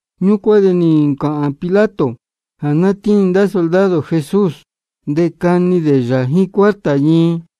Ñúcuán de nī ncāhān Pilato jā ná tíin ndá soldado Jesús, de cani dē yā jíín cuarta ñii.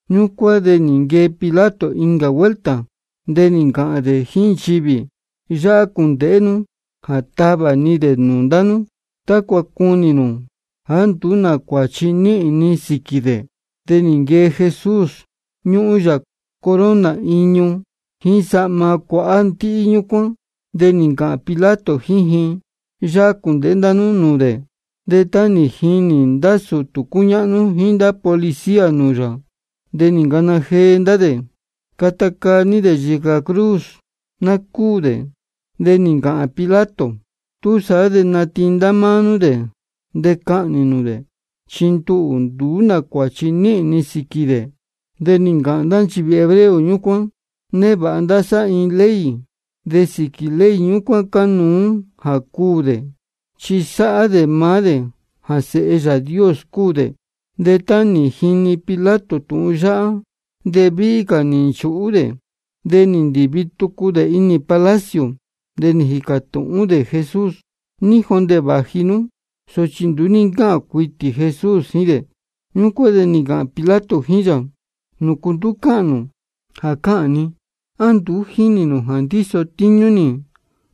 Ñúcuán de nī nquee Pilato incā vuelta, de nī ncāhān dē jíín nchivī: Yáhá cūndēhé nú jā távā ni dē nūū ndá nú, tácua cunī nū jāá nduú nā cuāchi níhīn ni sīquī dē. De nī nquee Jesús, ñúhún yā corona iñu jíín sahma cuahá ndíhí ñúcuán. De nī ncāhān Pilato jíín ji: Yáhá cūndēhé ndá nú nūū dē. De tá nī jinī ndá sūtū cúñáhnú jíín ndá policía nūū yā, de nī ncana jee ndá dē: Cata caa ní dē yīcā cruz, ná cúū dē. De nī ncāhān Pilato: Túsaá de natiin ndá máá nú dē de cahnī nū dē. Chi nduhū nduú nā cuāchi níhīn ni sīquī dē. De nī ncāhān ndá nchivī hebreo ñúcuán: Névāha ndá sá iin ley, de sīquī ley ñúcuán cánuú jā cuū dē, chi sáhá dē maá dē jā Sēhe Yāā Dios cúu dē. De tá nī jini Pilato tūhun yáhá, de víhí cā nī nchūhú dē. De nī ndīvi tucu dē inī palacio, de nī jīcā tūhún dē Jesús: ¿Ní jondē vāji nú? Sochi nduú ní ncáhān cuitī Jesús jíín dē. Ñúcuán de nī ncāhān Pilato jíín yā: ¿Nūcu nduú cáhān nū jā cáhān ni? ¿A nduú jínī nū jā ndíso tíñú nī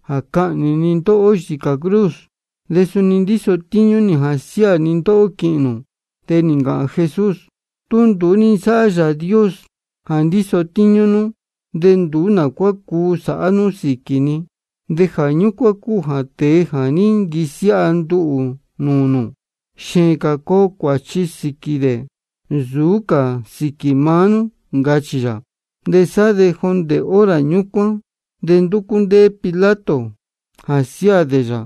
jā cahnī ni ndóhó yīcā cruz, de suni ndíso tíñú nī jā siáā ni ndóhó quīhīn nū? De nī ncāhān Jesús: Tú nduú ní nsáhá Yāā Dios jā ndíso tíñú nú, de nduú nā cuá cuu sāhá nú sīquī ni. De jā ñúcuán cúu jā tēe jā ní nquisiáha nduhū nūū nū, xēēn cā coo cuāchi sīquī dē nsūú cā sīquī maá nú, ncachī yā. De sá de jondē hora ñúcuán de ndúcú ndéé Pilato jā siáā dē yā.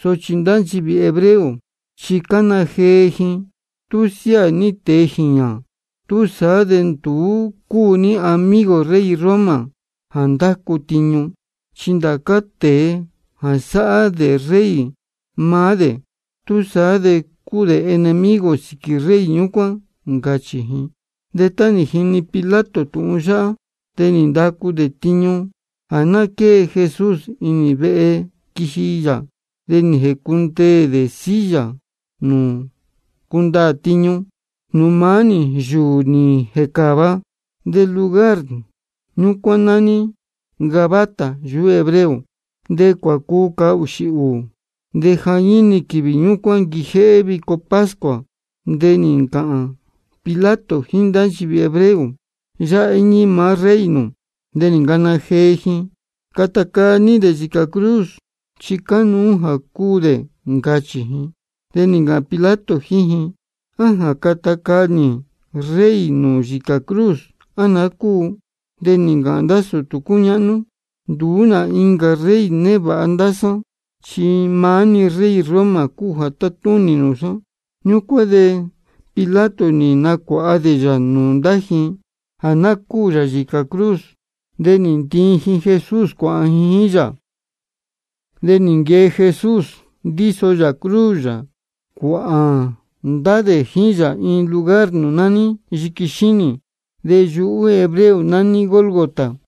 Sochi ndá nchivī hebreo chi cána jee ji: Tú siáā ní tēe jīñā, túsaá de nduú cúu ní amigo rey Roma jā ndácu tiñu. Chi ndācá tēe jā sáhá dē rey maá dē, túsaá de cúu dē enemigo sīquī rey ñúcuán, ncachī ji. De tá nī jini Pilato tūhun yáhá, de nī ndacu dē tiñu jā ná quée Jesús inī vehe quiji yā. De nī jēcundeē dē silla nūū cúndaā tiñu, nūū maá-ni yūū nī jēcāva, de lugar ñúcuán nání Gabata yuhú hebreo. De cuacuu cahūxī ūū, de jañíni quīvī ñúcuán quijéhé vico pascua. De nī ncāhān Pilato jíín ndá nchivī hebreo: Yáhá íñí maá rey nū. De nī ncana jee ji: Cata caa ní dē yīcā cruz, chi cánuú jā cuū dē, ncachī ji. De nī ncāhān Pilato jíín ji: ¿A jā cata caa nī rey nū yīcā cruz, á naá cúu? De nī ncāhān ndá sūtū cúñáhnú: Nduú nā incā rey névāha ndá sá, chi maá-ni rey Roma jā tátúnī nūū sá. Ñúcuán de Pilato nī nacuāha dē yā nūū ndá ji jā ná cúū yā yīcā cruz. De nī ntiin ji Jesús cuāhān ji jíín yā. De nī nquee Jesús, ndíso yā cruz yā, cuāhān ndá dē jíín yā iin lugar nūū nání Yiqui Xínī, de yuhú hebreo nání Gólgota.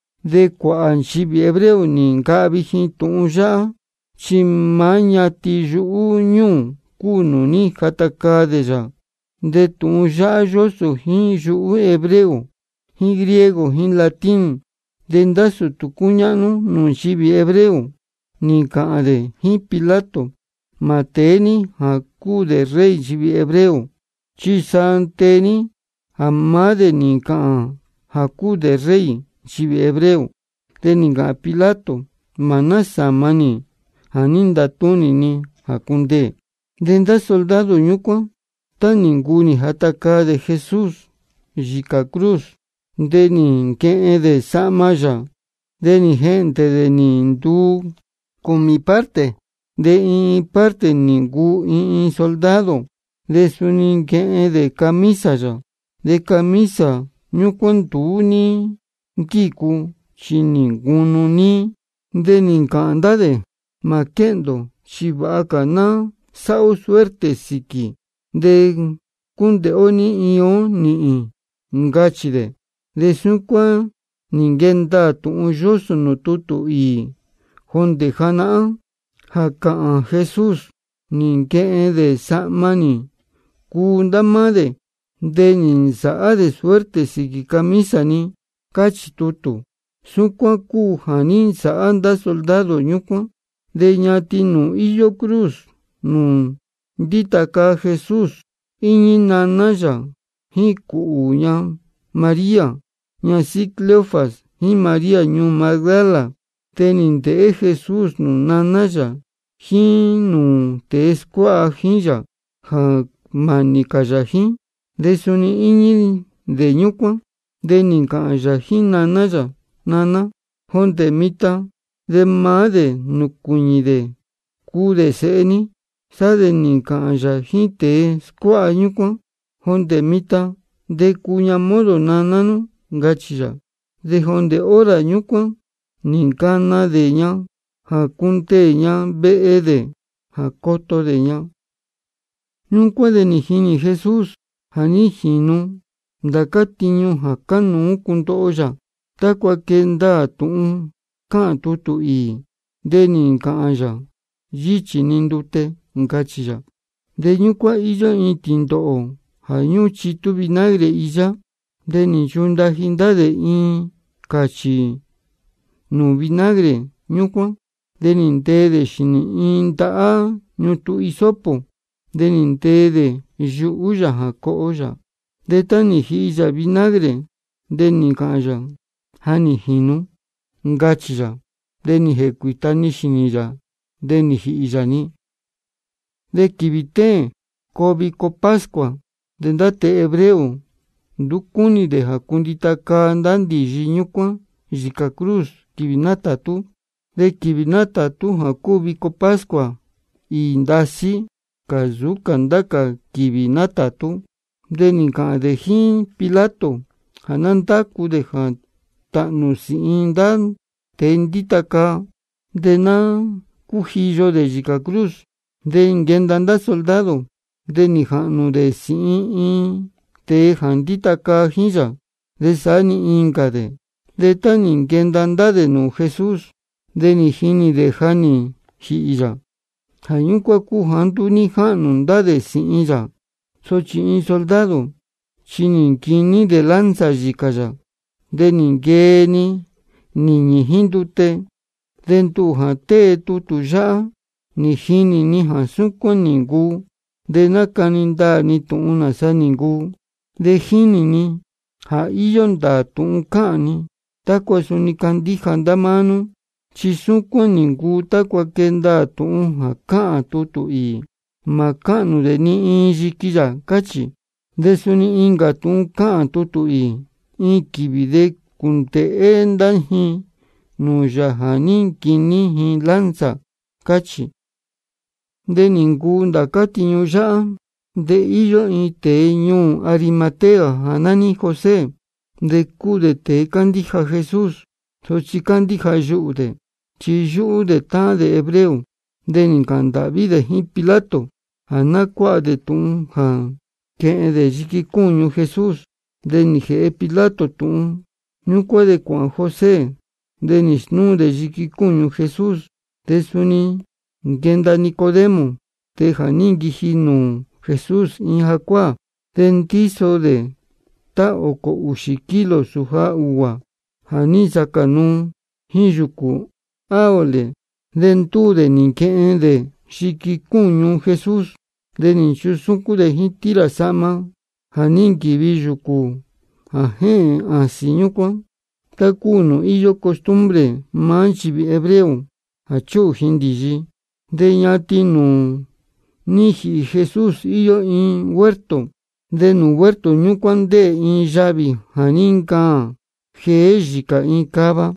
De cuāhā nchivī hebreo nī ncahvi ji tūhun yáhá, chi maá ñatin yuhú ñúū cúu nūū ní jata caa dē yā. De tūhun yáhá yósō jíín yuhú hebreo jíín griego jíín latín. De ndá sūtū cúñáhnú nūū nchivī hebreo, nī ncāhān dē jíín Pilato: Mā tēé ní jā cúu dē Rey nchivī hebreo, chi sa tee ní jā maá dē nī ncāhān jā cúu dē Rey nchivī hebreo. De nī ncāhān Pilato: Mā násāma nī jā ní ntatúnī ni jā cundeē. De ndá soldado ñúcuán, tá nī ncuu nī jata caa dē Jesús yīcā cruz, de nī nquehen dē sahma yā, de nī jehndē dē nī nduu cūmī parte, de iin iin parte nī ncuu iin iin soldado. De suni nī nquehen dē camisa yā. De camisa ñúcuán nduú ní nquícu, chi nī ncunu níí. De nī ncāhān ndá dē: Mā quéhndē ō, chi vāha cā ná sáhá ó suerte sīquī, de cúndēhé ó ní iin ó nīhīn, ncachī dē. De súcuán nī nquee ndaā tūhun yósō nūū tutū īī jondē janahán jā cāhān Jesús: Nī nquehen dē sahma nī cuu ndá máá dē. De nī nsāhá dē suerte sīquī camisa ni. Cáchī tutū. Súcuán cúu jā ní nsāhá ndá soldado ñúcuán. De ñatin nūū íyó cruz nūū ndíta caa Jesús íñí naná yā jíín cūhū ña María ñasíhí Cleofas, jíín María ñuū Magdala. De nī ndēhé Jesús nūū naná yā jíín nūū tēe scuáha jíín yā jā mānī cā yā jíín, chi suni íñí dē ñúcuán. De nī ncāhān yā jíín naná yā: Naná, jondē mitan de maá dē nūcuīñī dē cuu dē sēhe ní. Sá de nī ncāhān yā jíín tēe scuáha ñúcuán: Jondē mitan de cuu ña modo naná nú, ncachī yā. De jondē hora ñúcuán nī ncana dē ña jā cundeē ña vehe dē jā coto dē ña. Ñúcuán de nī jinī Jesús jā ní jīnu ndācá tiñu jā cánuú cundoho yā. De tácua quee ndaā tūhun cáhān tutū īī, de nī ncāhān yā: Yíchī ni ndute, ncachī yā. De ñúcuán íyó iin tīndōhō jā ñúhún chitú vinagre īyá. De nī nchundaji ndá dē iin cāchī nūū vinagre ñúcuán, de nī ntee dē xīnī iin ndahá ñutun hisopo, de nī ntee dē yuhú yā jā coho yā. De tá nī jihi yā vinagre, de nī ncāhān yā: Ja nī jīnu, ncachī yā. De nī jēcuīta-ni xīnī yā, de nī jīhī yā-ni. De quīvī téēn coo vico pascua. De ndá tēe hebreo nduú cúnī dē jā cundita caa ndá ndīyi ñúcuán yīcā cruz quīvī nátātú. Chi quīvī nátātú jā cúu vico pascua, īī ndasí cā nsūú cā ndá cā quīvī nátātú. De nī ncāhān dē jíín Pilato jā ná ndácu dē jā tāhnū sīhin ndá tēe ndíta caa, de ná cújiyo dē yīcā cruz. De nī nquenda ndá soldado, de nī jāhnū dē sīhin iin tēe jā ndíta caa jíín yā, de saá-ni incā dē. De tá nī nquenda ndá dē nūū Jesús, de nī jinī dē ja nī jīhī yā. Jā ñúcuán cúu jāá nduú ní jáhnū ndá dē sīhin yā. Sochi iin soldado chi nī nquiní dē lanza yīcā yā, de nī nquee-ni nīñī jíín ndute. De nduhū jā tée tutū yáhá, nī jinī ni jā súcuán nī ncuu, de nácani ndaā ni tūhun nāsa nī ncuu. De jínī ni jā íyó ndāā tūhun cáhān ni, tácua suni candíja ndá máá nú. Chi súcuán nī ncuu tácua quee ndaā tūhun jā cáhān tutū īī: Mā cáhnū dē ni iin yiqui yā, cáchī. De suni incā tūhun cáhān tutū īī: Iin quīvī de cūndēhé ndá ji nūū Yāā jā ní nquiní ji lanza, cáchī. De nī ncuu ndācá tiñu yáhá. De íyó iin tēe ñuū Arimatea jā nání José, de cúu dē tēe cándíja Jesús. Sochi cándíja yuhū dē, chi yúhú dē táhán dē hebreo. De nī ncāhān ndāhví dē jíín Pilato jā ná cuáha dē tūhun jā quehen dē yiqui cúñu Jesús. De nī jēhe Pilato tūhun. Ñúcuán de cuāhān José, de nī snúu dē yiqui cúñu Jesús. De suni nī nquenda Nicodemo, tēe jā ní nquiji nūū Jesús iin jacuáā. De ndíso dē tá ōcō ūxī kilo sūja ūguā jā ní nsacā nuu jíín yūcū áloe. De ndúū dē nī nquehen dē yiqui cúñu Jesús, de nī nchusúcún dē jíín tira sahma jā ní nquīvi yūcū jā jéhēn āsīn ñúcuán, tá cúu nūū íyó costumbre maá nchivī hebreo jā chúhū ji ndīyi. De ñatin nūū ní jīhī Jesús íyó iin huerto. De nūū huerto ñúcuán ndéē iin yavī jā ní ncaān jeé yīcā iin cava,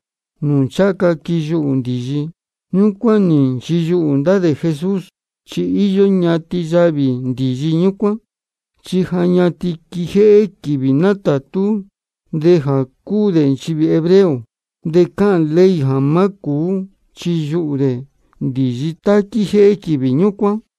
nūū ncháha ca quiyuhū ndīyi. De ñúcuán nī nchiyuhū ndá dē Jesús, chi íyó ñatin yavī ndīyi ñúcuán. Chi ja ñatin quijéhé quīvī nátātú dē jā cúu dē nchivī hebreo, de cáhān ley jā má cūú chiyuhū dē ndīyi tá quíjéhé quīvī ñúcuán.